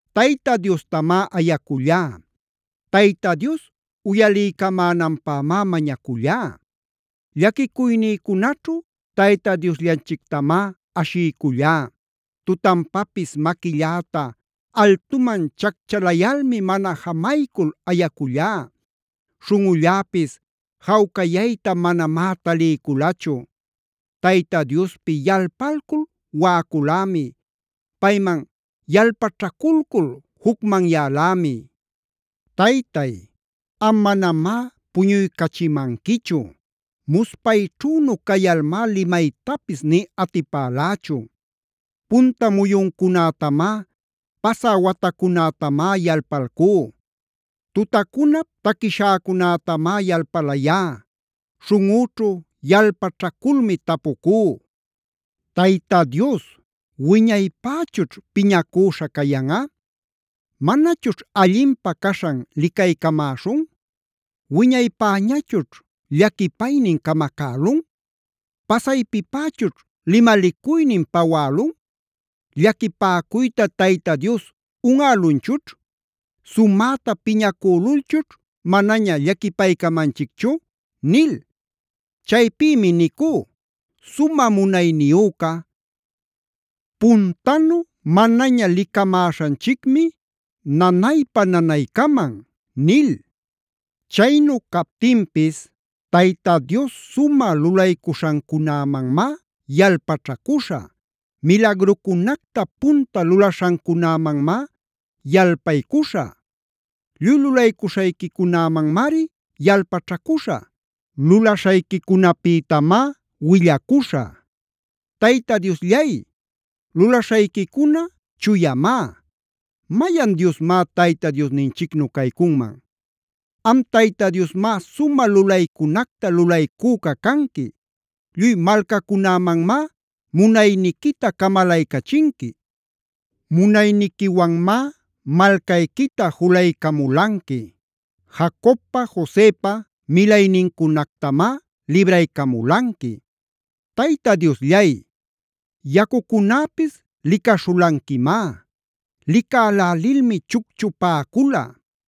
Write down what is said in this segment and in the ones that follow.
Tayta Diostamá ayacullá. Tayta Dios uyaliycamänanpämá mañacullá. Llaquicuynïcunaćhu Tayta Diosllanchictamá ashiycullá. Tutanpapis maquilläta altuman chacchalayalmi mana jamaycul ayacullá. Śhunꞌulläpis jawcayayta manamá taliyculachu. Tayta Diospi yalpalcul waꞌaculämi. Payman yalpaćhaculcul jucmanyalämi. Taytay, am manamá puñuycachimanquichu. Muspayćhünu cayalmá limaytapis nï atipalächu. Punta muyuncunätamá, pasä watacunätamá yalpalcú. Tutacunap taquishäcunätamá yalpalayá. Śhunꞌüćhu yalpaćhaculmi tapucú: “Tayta Dios ¿wiñaypächućh piñacüśha cayanꞌa? ¿Manachućh allinpä caśhan licaycamäśhun? ¿Wiñaypäñachućh llaquipaynin camacälun? ¿Pasaypipächućh limalicuynin pawälun? ¿Llaquipäcuyta Tayta Dios unꞌälunchućh? ¿Sumäta piñacülulchućh manaña llaquipaycamanchicchu?” nil. Chaypïmi nicú: “Sumä munayniyüca, puntanu manaña licamäśhanchicmi, nanaypa-nanaycaman” nil. Chaynu captinpis Tayta Dios sumä lulaycuśhancunämanmá yalpaćhacuśhä. Milagrucunacta punta lulaśhancunämanmá yalpaycuśhä. Lluy lulaycuśhayquicunämanmari yalpaćhacuśhä. Lulaśhayquicunapïtamá willacuśhä. Tayta Diosllay, lulaśhayquicuna chuyamá. ¿Mayan Diosmá Tayta Diosninchicnu caycunman? Am Tayta Diosmá sumä lulaycunacta lulaycüca canqui. Lluy malcacunämanmá munayniquita camalaycachinqui. Munayniquiwanmá malcayquita julaycamulanqui. Jacobpa, Josepa milaynincunactamá libraycamulanqui. Tayta Diosllay, yacucunäpis licaśhulanquimá. Licälälilmi chucchupäcula;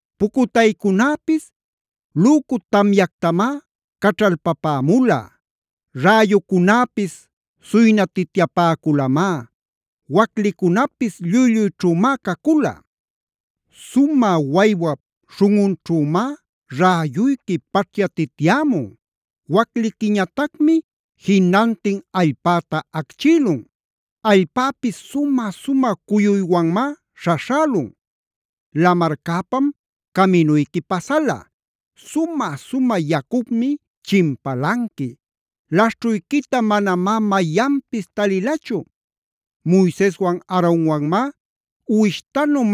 Pucutaycunäpis lücu tamyactamá caćhalpapämula. Räyucunäpis suynatityapäculamá, waclicunapis lluy-lluyćhümá cacula. Sumä waywap śhunꞌunćhümá räyuyqui paćhyatityämun. Wacliquiñatacmi jinantin allpäta acchïlun; allpäpis sumä-sumä cuyuywanmá śhaśhälun. Lamarcäpam caminuyqui pasala. Sumä-sumä yacupmi chimpalanqui; laśhćhuyquita manamá mayanpis talilachu. Moiseswan Aaronwanmá uwishtanu